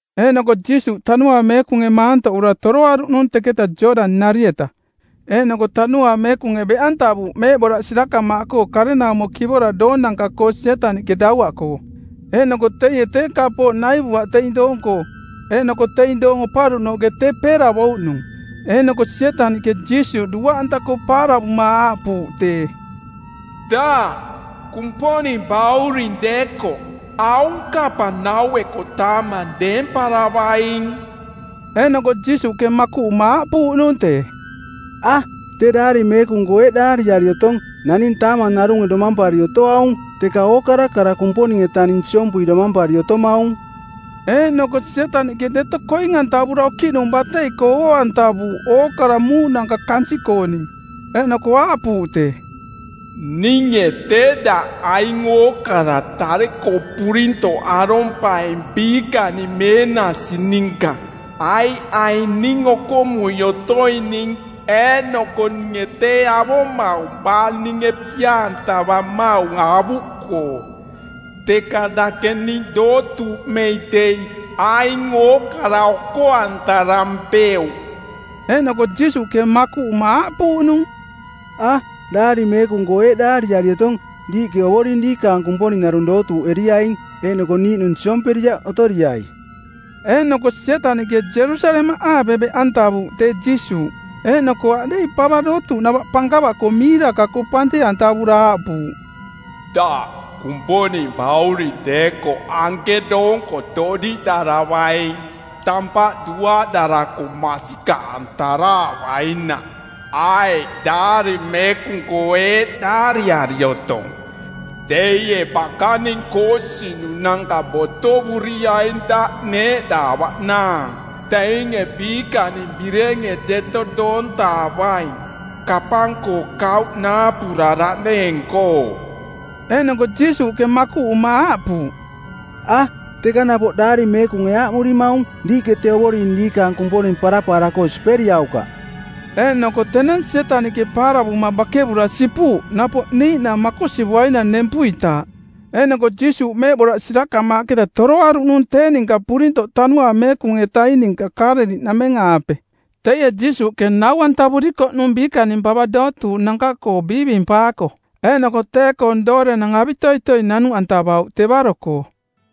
Eeꞌnoko Jiisuuꞌ Tanuaang Meekunge maantoꞌura toroaruꞌnung teketa Jooꞌdani-nari-eta, eeꞌnoko Tanuaang Meekunge beꞌantavuuꞌ meeꞌboraꞌ sirakamaaꞌkoo karenaumo kivora doonanka-koo Sietaniꞌke dauaꞌkoo; Eeꞌnoko teie tee kapooꞌ naivuaꞌ teing doong-koo. Eeꞌnoko teing doong oparuꞌnooꞌke tee peeravouꞌnung. Eeꞌnoko Sietaniꞌke Jiisuuꞌ duaꞌanta-koo paaravuma aaꞌpuuꞌ tee, “Daꞌ Kumponing bauring deekoꞌ aung kapang naueko taamang deemparavaing.” Eeꞌnoko Jiisuuꞌke makuꞌuma aaꞌpuuꞌnung tee, “A, tee Daari Meekung-koo eeꞌ daariari otong, ‘Naning taamang narunge domampari otoaung, teka ookara kara Kumponing-etaning siompui domampari otomaung.’” Eeꞌnoko Sietaniꞌke deto koing-antavura okiꞌnung batei-koo oo-antavuuꞌ ookara muuꞌnanka kansiꞌkooning. Eeꞌnoko aaꞌpuuꞌ tee, “Ninge tee daꞌ aing ookara tare-koo purintoꞌ arompaing biikaning meenasi ninka, aiꞌ aing ning okomui otoining eeꞌnoko ninge tee avomaung baa ninge pia-antavamaung avuꞌkoo. Teka dake ning dootuuꞌmei dei aing ookara oko-antarampeuꞌ.” Eeꞌnoko Jiisuuꞌke makuꞌuma aaꞌpuuꞌnung, “A, Daari Meekung-koo eeꞌ daariari otong: ‘Diiꞌke Ovoring diikaang Kumponing narung dootuuꞌeriaing, eeꞌnoko niiꞌnung siomperiaꞌ otoriai.’” Eeꞌnoko Sietaniꞌke Jerusalemaꞌaape beꞌantavuuꞌ tee Jiisuuꞌ, eeꞌnoko aꞌdeiꞌ pava dootuuꞌnava pankava-koo miiraka-koo panteꞌantavura aaꞌpuuꞌ, “Daꞌ Kumponing bauring deekoꞌ anke doonko toꞌdiꞌdaravaing, tampaꞌ duaꞌdarako masikaꞌantaraavainaꞌ, aiꞌ Daari Meekung-koo eeꞌ daariari otong, ‘Teie bakaning koosinunanka botovuriaing daꞌ neeꞌdaavaꞌnaang. Teinge biikaning birenge deto doontaavaing, kapang-koo kauꞌ naapuraraꞌneeng-koo.’” Eeꞌnoko Jiisuuꞌke makuꞌuma aaꞌpuuꞌ, “A, teka napoꞌ Daari Meekunge aaꞌmurimaung, ‘Diiꞌke tee Ovoring diikaang Kumponing parapaara-koo siperiaukaꞌ.’” Eeꞌnoko tenang Sietaniꞌke paaravuma bakevura sipuuꞌ napoꞌ niiꞌnang makosivuainang nempuitaaꞌ. Eeꞌnoko Jiisuuꞌ meeꞌboraꞌ sirakamaaꞌketa toroaruꞌnung tee ninka purintoꞌ Tanuaang Meekung-etaing ninka Kaaleliꞌnameng-aape; Teie Jiisuuꞌke nau-antavurikoꞌnung biikaning pava dootuuꞌnanka-koo biivimpaako, eeꞌnoko tee-koong doorenang avitoitoi nanuꞌantavauꞌ tevaro-koo;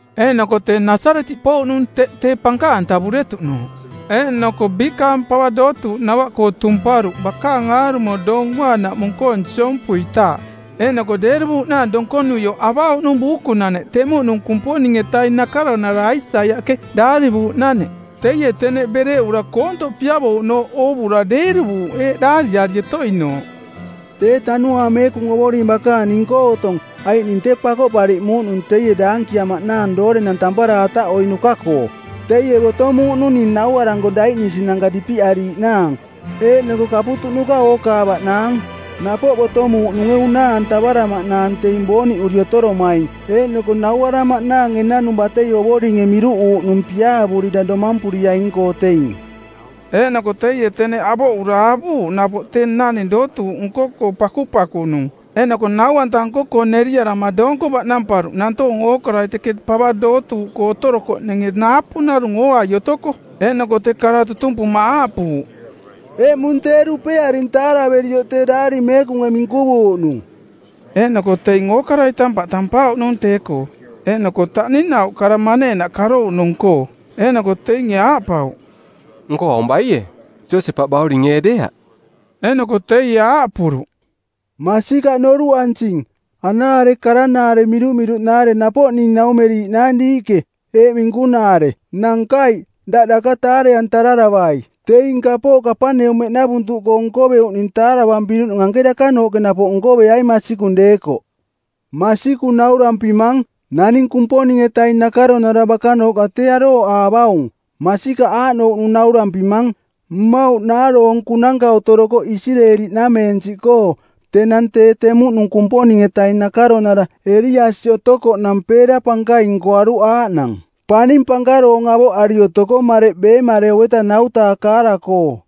Eeꞌnoko tee Nasaretiꞌ pouꞌnung teꞌ tee pankaꞌantavuretuꞌnooꞌ. Eeꞌnoko biikaang pava dootuuꞌnava-koo tumparuꞌ bakaang aarumo Doong Uaanaꞌmung-koong siompuitaaꞌ; Eeꞌnoko deeruvuuꞌnaang donkonuioꞌ avauꞌnung buukunaneꞌ temuꞌnung Kumponing-etaing nakaronarai Aisaiaꞌke daarivuuꞌnaneꞌ. Teie teneꞌ bereꞌura koontoꞌ piavouꞌnooꞌ oovura deeruvuuꞌ eeꞌ daariari otoinooꞌ, “Tee Tanuaang Meekung Ovoring bakaang ning-koo otong aiꞌ ning tee pakoꞌpariꞌmuuꞌnung teie daankiamaꞌnaang doorenang tampara ataꞌoiꞌnuka-koo. Teie botomuuꞌnung ning nauaranko daiꞌnisinanka dipiꞌariiꞌnaang eeꞌnoko kaputuꞌnuka ookaavaꞌnaang; Napoꞌ botomuuꞌnunge unaa-antavaramaꞌnaang teing booniꞌuri otoromaing eeꞌnoko nauaramaꞌnaang enanung batei Ovoringe miruꞌuuꞌnung piaavurira domampuriaing-koo teing.” Eeꞌnoko teie teneꞌ avoꞌura avuuꞌ napoꞌ tee naning dootuuꞌ nko-koo pakupakunung eeꞌnoko nau-anta nko-koo neriarama doonko baꞌnamparuꞌ nantoonge ookarai teke pava dootuuꞌkoo otorokoꞌninge naapu narung ooai otoko; Eeꞌnoko tee kara tutumpuma aaꞌpuuꞌ, “Eꞌmung tee dupearing taaraverioꞌ tee Daari Meekunge minkuvuuꞌnung.” Eeꞌnoko teing ookarai tampaꞌ tampauꞌnung tee-koo, eeꞌnoko taꞌninauꞌ kara maneenaꞌ karouꞌnung-koo. Eeꞌnoko teinge aaꞌpauꞌ, “Nko aung baie, Josepaꞌ bauring ee deeaꞌ?” Eeꞌnoko teie aaꞌpuruꞌ, “Masikaꞌ noruꞌansing, anaare karanaare mirumiruꞌnaare napoꞌ ning naumeriiꞌnaang diiꞌke, eeꞌ minkunaare, ‘Nankaiꞌ, daꞌ daka taare-antararavai. Teing kapooꞌ Kapaneumeꞌnavuntuꞌkoo nkoveuꞌning taaravampiruꞌning anke dakanooꞌke napoꞌ nkoveaing masikung deekoꞌ.’ Masikung naurampimang, naning Kumponing-etaing nakaronara bakanooꞌka tee arooꞌaavaung. Masikaꞌ aaꞌnouꞌnung naurampimang: Mmauꞌ naaroonkunanka otorokoꞌ Isireeli-nameensiꞌkoo tenang tee temuꞌnung Kumponing-etaing nakaronara Eliasi otokoꞌnang peera pankaing nkoaruꞌ aaꞌnang, paning pankaroong avoꞌari otoko mareꞌ beemareu-eta ˜nau-taa kaara-koo.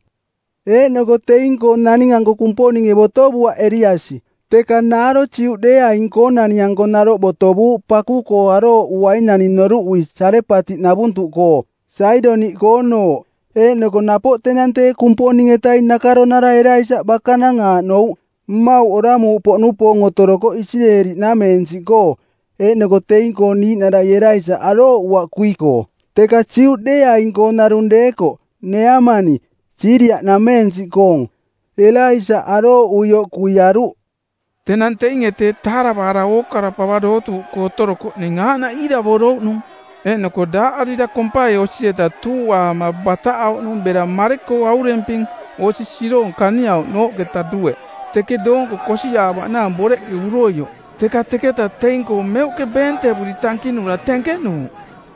Eeꞌnoko teing-koo naning-anko Kumponinge botovuaꞌ Eliasi, teka naaro Juꞌdeeaing-koonani-anko naroꞌ botovuuꞌ paku-koo arooꞌuainani noruꞌui Sarepatiꞌnavuntuꞌkoo, Saidoniꞌkoonooꞌ. Eeꞌnoko napoꞌ tenang tee Kumponing-etaing nakaronara Elaisaꞌ bakanang aaꞌnouꞌ, mmauꞌ oramuuꞌpoꞌnupoong otorokoꞌ Isireeli-nameensiꞌkoo, eeꞌnoko teing-koo niiꞌnarai Elaisaꞌ arooꞌuaꞌ kui-koo, teka Juꞌdeeaing-koo narung deekoꞌ, Neeamani, Siiria-nameensiꞌkoong, Elaisaꞌ arooꞌuioꞌ kuiaruꞌ.” Tenang teinge teeꞌ taaravaara ookara pava dootuuꞌkoo otorokoꞌning aaꞌnaꞌ iiravorouꞌnung. Eeꞌnoko daaꞌarira kompai osi-eta tuuꞌaama bataꞌauꞌnung bera mare-koo auremping osi siroong kaniauꞌnooꞌketa dueꞌ, teke doonko kosiꞌaavaꞌnaang boreꞌke uroioꞌ. Teka teketaꞌ teing-koo meuꞌke beentevuri tankinura tenkenuuꞌ.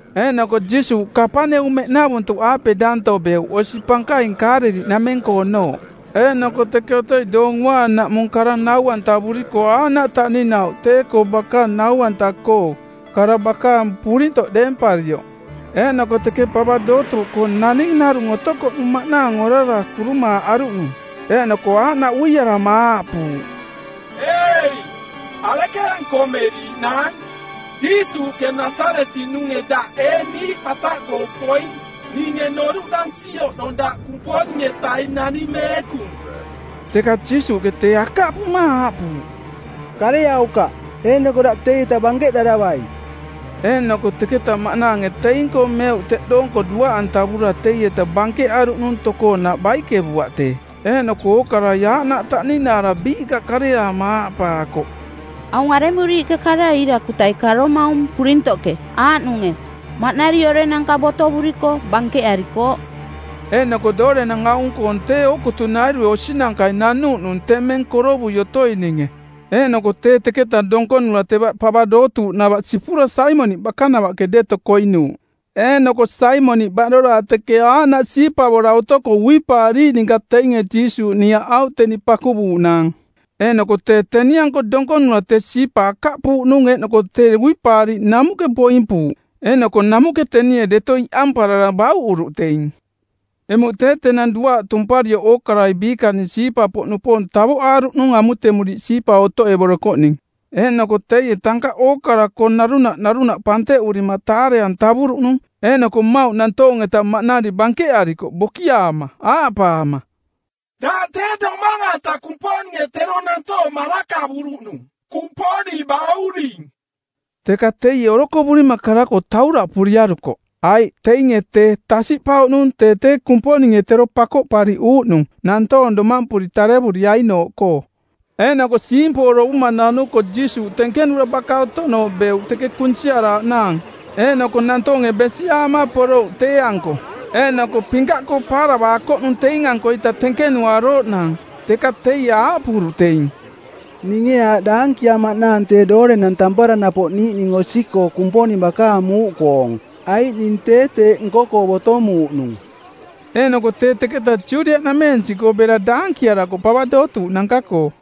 Eeꞌnoko Jiisuuꞌ Kapaneumeꞌnavuntuꞌaape danto beuꞌ, osi pankaing Kaaleliꞌnameng-koonooꞌ; Eeꞌnoko teke otoi Doong Uaanaꞌmung kara nau-antavuriko aaꞌnaꞌ taꞌninauꞌ tee-koo bakaang nau-anta-koo, kara bakaang purintoꞌ deemparioꞌ; Eeꞌnoko teke pava dootuuꞌkoo naning narung otokoꞌnung maꞌnaang orara kurumaaꞌaruꞌnung. Eeꞌnoko aaꞌnaꞌ uiarama aaꞌpuuꞌ, “Ei, arekeeꞌ nkomeriiꞌnaang, Jiisuuꞌke Nasaretiꞌnunge? Daꞌ ee niiꞌ bataꞌkoo poing? Ninge noruꞌdansi oꞌnong daꞌ Kumponing-etaing Naning Meekung.” Teka Jiisuuꞌke tee akaꞌpuma aaꞌpuuꞌ, “Kareaukaꞌ, eeꞌnoko daꞌ teietaꞌ bankeꞌdaravai.” Eeꞌnoko teketa maꞌnaange teing-koo meuꞌ teꞌ doonko duaꞌantavura teieta bankeꞌaruꞌnung tokoonaꞌ baikevuaꞌ tee. Eeꞌnoko ookarai aaꞌnaꞌ taꞌninaara biiꞌka kareaama aaꞌpaakoꞌ, “Aung aremuriiꞌke karai iirakutai karomaung purintoꞌke aaꞌnunge maꞌnari orenanka botovuriko bankeꞌarikooꞌ?” Eeꞌnoko doorenang aung-koong tee ookutunairue osinankai nanuuꞌnung temeng korovui otoininge. Eeꞌnoko tee teketaꞌ donkonura teva pava dootuuꞌnava sipura Saimoniꞌ bakanavaꞌke deto koinuuꞌ. Eeꞌnoko Saimoniꞌ baꞌdoraa teke aaꞌnaꞌ siipavora otoko uipaariiꞌ ninka teinge Jiisuuꞌ niaꞌauꞌ teni pakuvuuꞌnaang. Eeꞌnoko tee teni-anko donkonura tee siipa akaꞌpuuꞌnung eeꞌnoko tee uipaariiꞌ namuꞌke boimpuuꞌ. Eeꞌnoko namuꞌke tenie deto iꞌamparara bauꞌuruꞌ teing. Emuꞌ tee tenang duaaꞌ tumparioꞌ ookarai biikaning siipa-poꞌnupoong tavoꞌaaruꞌnung amutemuriiꞌ siipa otoꞌevorokoꞌning. Eeꞌnoko teie tankaꞌ ookara-koo narunaꞌ narunaꞌ panteꞌurima taare-antavuruꞌnung. Eeꞌnoko mmauꞌ nantoong-eta maꞌnari bankeꞌarikoꞌ bokiaama aaꞌpaama, “Daꞌ tee Domang-anta Kumponinge tero nantoong marakavuruꞌnung, Kumponing bauring.” Teka teie orokovurima kara-koo tauraꞌpuriarukoꞌ, aiꞌ teinge tee tasiꞌpauꞌnung tee tee Kumponinge tero Pakoꞌpariꞌuuꞌnung˜ nantoong domampuri tarevuriainooꞌkoo. Eeꞌnoko siimpoorovuma˜ nanuko Jiisuuꞌ tenkenura baka otoꞌnooꞌ beuꞌ teke kunsiaraaꞌnaang. Eeꞌnoko nantoonge besiꞌaama porouꞌ tee-anko. Eeꞌnoko pinkaꞌkoo paaravaakoꞌnung teing-ankoita tenkenuarooꞌnaang. Teka teie aaꞌpuruꞌ teing, “Ninge aaꞌ daankiamaꞌnaang tee doorenang tampara napoꞌ niiꞌning osi-koo Kumponing bakaang muuꞌkoong, aiꞌ ning tee teeꞌ nko-koo botomuuꞌnung.” Eeꞌnoko tee teketaꞌ Judiaꞌnameensiꞌkoo bera daankiarakoꞌ pava dootuuꞌnanka-koo.